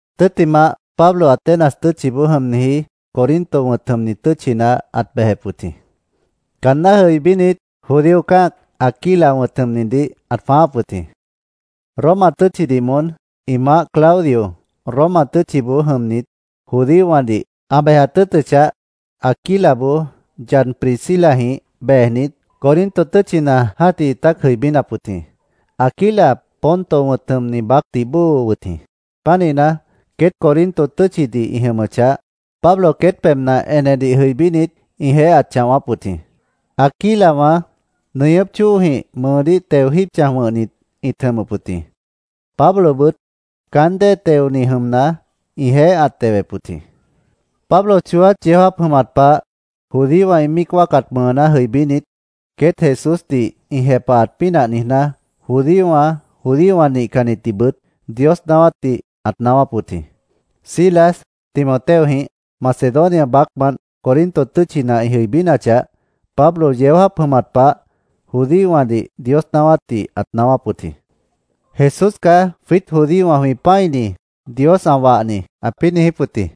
Tʉ́ttimah, Pablo Atenas tʉ́tchiboó jʉmniji Corinto wʉ̃t jʉmni tʉ́tchina ãt bejep wʉt jĩ. Caanná jʉibínit, judío cã́ac Aquila wʉ̃t jʉmnidih ãt jwãááp wʉt jĩ. Roma tʉ́tchidih moón ĩ maáh Claudio Roma tʉ́tchiboó jʉmnit judíowãdih ã bejat tʉ́ʉtʉchah, Aquilaboó yad Priscilajĩh bejnit, Corinto tʉ́tchina jã́tih ĩtát jʉibínap wʉt jĩ. Aquila Ponto wʉ̃t jʉmni baácdih bóo wʉt jĩ. Pánihna, queét Corinto tʉ́tchidih ĩ jʉmʉchah, Pablo queét pebhna enedih jʉibínit, ĩjeéh ãt chãwáp wʉt jĩ. Aquilawã nʉñʉ́pwã chóojĩh mʉʉdíh teo jíib chãj wʉ̃hnit ĩt jʉmʉp wʉt jĩ. Pablobʉt caán déedih teoni jʉmna, ĩjeéh ãt tewep wʉt jĩ. Pablo chooát yeó jáap jʉmat pah, judíowã ĩ míic wáacat mʉʉná jʉibínit, queét Jesúsdih ĩ jepahat pínah niijná, judíowã, judíowã nihcannitdihbʉt Dios naáwátdih ãt naáwáp wʉt jĩ. Silas Timoteojĩh Macedonia baácmant Corinto tʉ́tchina ĩ jʉibínachah, Pablo yeó jáap jʉmat pah judíowãdih Dios naáwátdih ãt naáwáp wʉt jĩ. “Jesús caá jwiít judíowã jwĩ pã́ini, Dios ã wahni”, ãpĩ́ niijíp wʉt jĩ.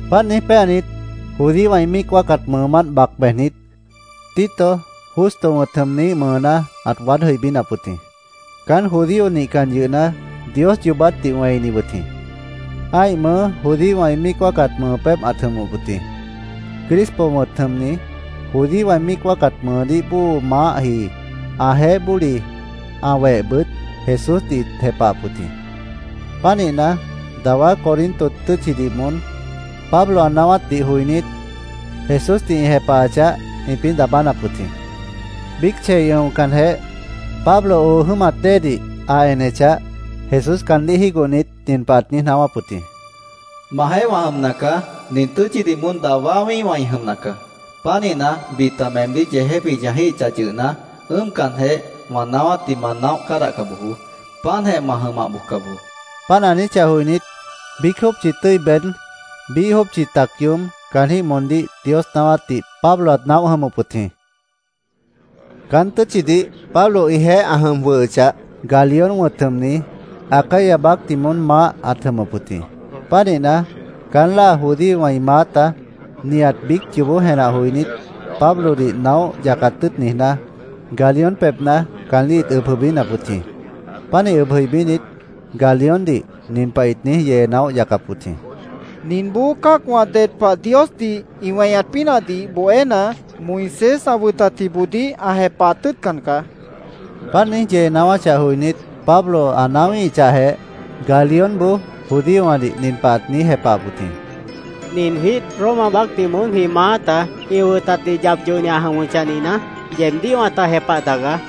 Páant niíj péanit, judíowã ĩ míic wáacat mʉʉmánt bac bejnit, Tito Justo wʉ̃t jʉmniíh mʉʉná ãt waád jʉibínap wʉt jĩ. Caán judío nihcan yʉhna, Dios yoobátdih wẽini wʉt jĩ. Ã́ih mʉʉ́ judíowã ĩ míic wáacat mʉʉ pébh ãt jʉmʉp wʉt jĩ. Crispo wʉ̃t jʉmni, judíowã ĩ míic wáacat mʉʉdíh bóo maáhji, ãjeéh bóli, ã wehbʉt, Jesúsdih ĩt jepahap wʉt jĩ. Pánihna, dawá Corinto tʉ́tchidih moón Pablo ã naáwátdih joinít, Jesúsdih ĩ jepahachah, ĩpĩ́ daabánap wʉt jĩ. Biíc chei ʉ̃ocanjeh, Pablo oo jʉ́mat déedih ã enechah, Jesús caandíh jígohnit, nin pah ãt niíj naáwáp wʉt jĩ. “Majeéh wã jʉmna caá. Nin tʉ́tchidih moón dawá wĩ́ihwã ĩ jʉmna caá. Pánihna, bita meemdíh yeejép ĩ chãjíhichah yʉhna, ʉ́ʉmcanjeh, wã naáwátdih ma naóh cádahca bojoó. Páantjeh ma jʉmah bojca bojoó”, ãt niijíp wʉt jĩ. Páant ã niijíchah joinít, biíc jópchi tʉ́i beéd, biíh jópchi tac yoób caanjĩ́h moondíh Dios naáwátdih Pablo ãt naóh jʉmʉp wʉt jĩ. Caán tʉ́tchidih Pablo ĩjeéh ã jʉm jwʉhʉchah, Galión wʉ̃t jʉmni, Acaya baácdih moón maáh ãt jʉmʉp wʉt jĩ. Pánihna, caán láa judíowã ĩ maáta nihat biíc yoobó jenah joinít, Pablodih naóh yacat tʉ́ʉt niijná, Galión pebhna caandíh ĩt ʉb jʉibínap wʉt jĩ. Pánih ʉb jʉibínit, Galióndih nin pah ĩt niíj yee naóh yacap wʉt jĩ: —Ninboó cã́acwã ded pah Diosdih ĩ weñat pínahdih bohéna, Moisés ã wʉtatjiboodíh ã jepahat tʉ́ʉtcan caá, ĩt niijíp wʉt jĩ. Páant ĩ niíj yee naáwáchah joinít, Pablo ã naáwíhichahjeh, Galiónboó judíowãdih nin pah ãt niíj jepahap wʉt jĩ: —Nin jwiít Roma baácdih moón jwĩ maáta ĩ wʉtatdih yap yohni ã jʉmʉchah nihna, yeebdíh wãta jepah tagaá.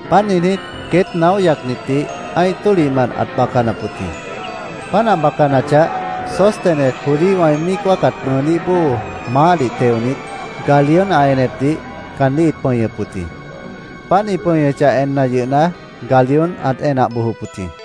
Páant niijnít, queét naóh yacnitdih ã́ih tólihmant ãt bacanap wʉt jĩ. Páant ã bacanachah, Sóstenes, judíowã ĩ míic wáacat mʉʉdíh bóo maáhdih teonit, Galión ã enepdih caandíh ĩt pʉñʉp wʉt jĩ. Páant ĩ pʉñʉchah enna yʉhna, Galión ãt enah bojop wʉt jĩ.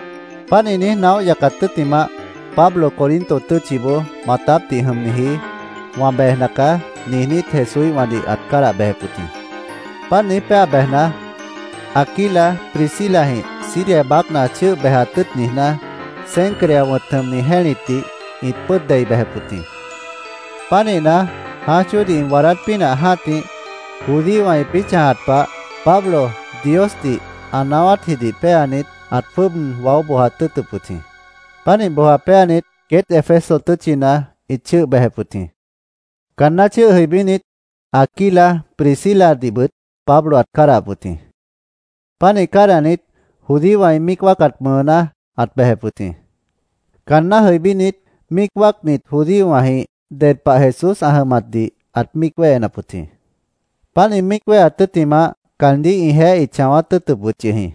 Páant ĩ niíj naóh yacat tʉ́ttimah, Pablo Corinto tʉ́tchiboó maatápdih jʉmniji “Wã bejna caá”, niijnít, Jesúíhwãdih ãt cádah bejep wʉt jĩ. Páant niíj péa bejna, Aquila Priscilajĩh Siria baácna chʉ́ʉh bejat tʉ́ʉt niijná, Cencrea wʉ̃t jʉmni jẽ́litdih ĩt pʉ́ʉd dei bejep wʉt jĩ. Pánihna, jãáj chóodih ĩ waadát pínah jã́tih, judíowã ĩpĩ́ chãjat pah, Pablo Diosdih ã naáwátjidih péanit, ãt jwʉ́ʉb waó bojat tʉ́ʉtʉp wʉt jĩ. Pánih boja péanit, queét Éfeso tʉ́tchina ĩt chʉ́ʉh bejep wʉt jĩ. Caanná chʉ́ʉh jʉibínit, Aquila Prisciladihbʉt Pablo ãt cádahap wʉt jĩ. Pánih cádahnit, judíowã ĩ míic wáacat mʉʉná ãt bejep wʉt jĩ. Caanná jʉibínit, míic wáacnit judíowãjĩh ded pah Jesús ã jʉmatdih ãt míic wéhenap wʉt jĩ. Páant ĩ míic wéheat tʉ́ttimah, caandíh ĩjeéh ĩt chãwát tʉ́ʉtʉp wʉt yʉh jĩ.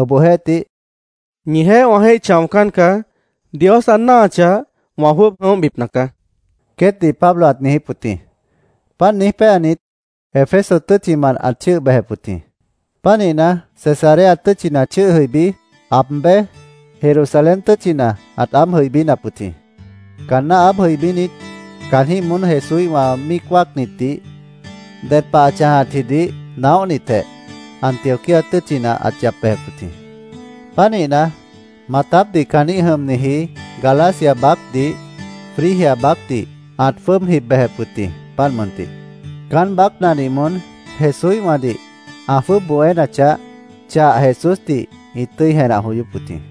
Obohjeéhtih, “Ñijeéh wã jéih chãocán caá. Dios ã náahachah, wã jwʉ́ʉb jʉ̃óhbipna caá”, queétdih Pablo ãt niijíp wʉt jĩ. Páant niíj péanit, Éfeso tʉ́tchimant ãt chʉ́ʉh bejep wʉt jĩ. Pánihna, Cesarea tʉ́tchina chʉ́ʉh jʉibí, aab béj, Jerusalén tʉ́tchina ãt aáb jʉibínap wʉt jĩ. Caanná aáb jʉibínit, caanjĩ́h moón Jesúíhwã míic wáacnitdih ded pah ã chãjatjidih naóhnitjeh, Antioquía tʉ́tchina ãt yap bejep wʉt jĩ. Pánihna, maatápdih caanjĩ́h jʉmniji Galacia baácdih, Frigia baácdih ãt jwʉ́ʉb jib bejep wʉt jĩ, páant mʉntih. Caán baácnadih moón Jesúíhwãdih ã jwʉ́ʉb bohénachah, chah Jesúsdih ĩt tʉ́i jenah joyóp wʉt jĩ.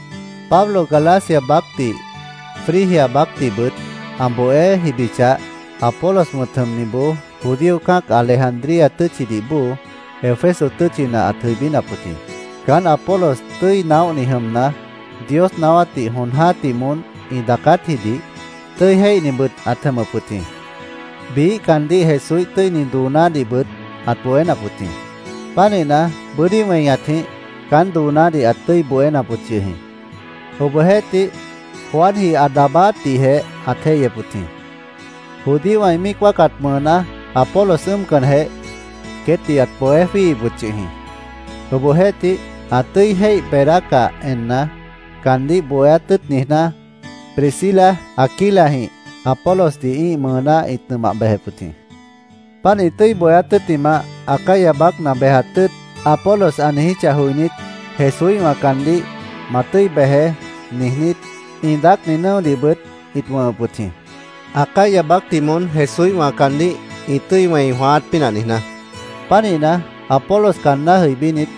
Pablo Galacia baácdih, Frigia baácdihbʉt ã bohé jibichah, Apolos wʉ̃t jʉmniboó, judío cã́ac Alejandría tʉ́tchidih bóo, Éfeso tʉ́tchina ãt jʉibínap wʉt jĩ. Caán Apolos tʉ́i naóhni jʉmna, Dios naáwátdih jon jã́tih moón ĩ daacátjidih tʉ́i jéihnibʉt ãt jʉmʉp wʉt jĩ. Biíh caandíh Jesúíh tʉ́ini doonádihbʉt ãt bohénap wʉt jĩ. Pánihna, bʉ́dí weñatjĩh caán doonádih ãt tʉ́i bohénap wʉt yʉh jĩ. Obohjeéhtih, Juanji ã daabáátdihjeh ãt jéihyep wʉt jĩ. Judíowã ĩ míic wáacat mʉʉná Apolos ʉ́ʉmcanjeh, queétdih ãt bohé jwíihip wʉt yʉh jĩ. Obohjeéhtih, ã tʉ́i jéih beedácah enna, caandíh bohéát tʉ́ʉt niijná, Priscila, Aquilajĩh Apolosdih ĩ́ih mʉʉná ĩt nʉmah bejep wʉt jĩ. Páant ĩ tʉ́i bohéát tʉ́ttimah, “Acaya baácna bejat tʉ́ʉt”, Apolos ã niijíchah joinít, Jesúíhwã caandíh “Ma tʉ́i bejeé”, niijnít, ĩ daácni nʉ́odihbʉt ĩt wʉ̃hʉp wʉt jĩ, Acaya baácdih moón Jesúíhwã caandíh ĩ tʉ́i wẽi jwãáát pínah niijná. Pánihna, Apolos caanná jʉibínit,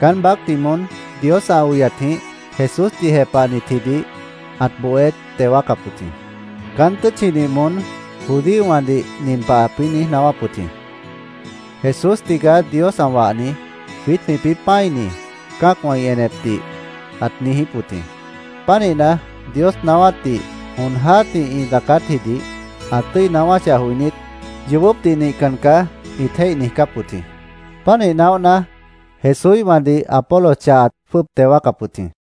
caán baácdih moón Dios ã oyatjĩh Jesúsdih jepahnitjidih ãt bohé teo wáacap wʉt jĩ. Caán tʉ́tchidih moón judíowãdih nin pah ãpĩ́ niíj naáwáp wʉt jĩ: “Jesús tigaá Dios ã wahni, jwiít jwĩpĩ́ pã́ini”, cã́acwã ĩ enepdih ãt niijíp wʉt jĩ. Pánihna, Dios naáwátdih jon jã́tih ĩ daacátjidih ã tʉ́i naáwáchah joinít, “Yoobópdih nihcan caá”, ĩt jéih niijcáp wʉt jĩ. Pánih naóhna, Jesúíhwãdih Apolos chah ãt jwʉ́ʉb teo wáacap wʉt jĩ.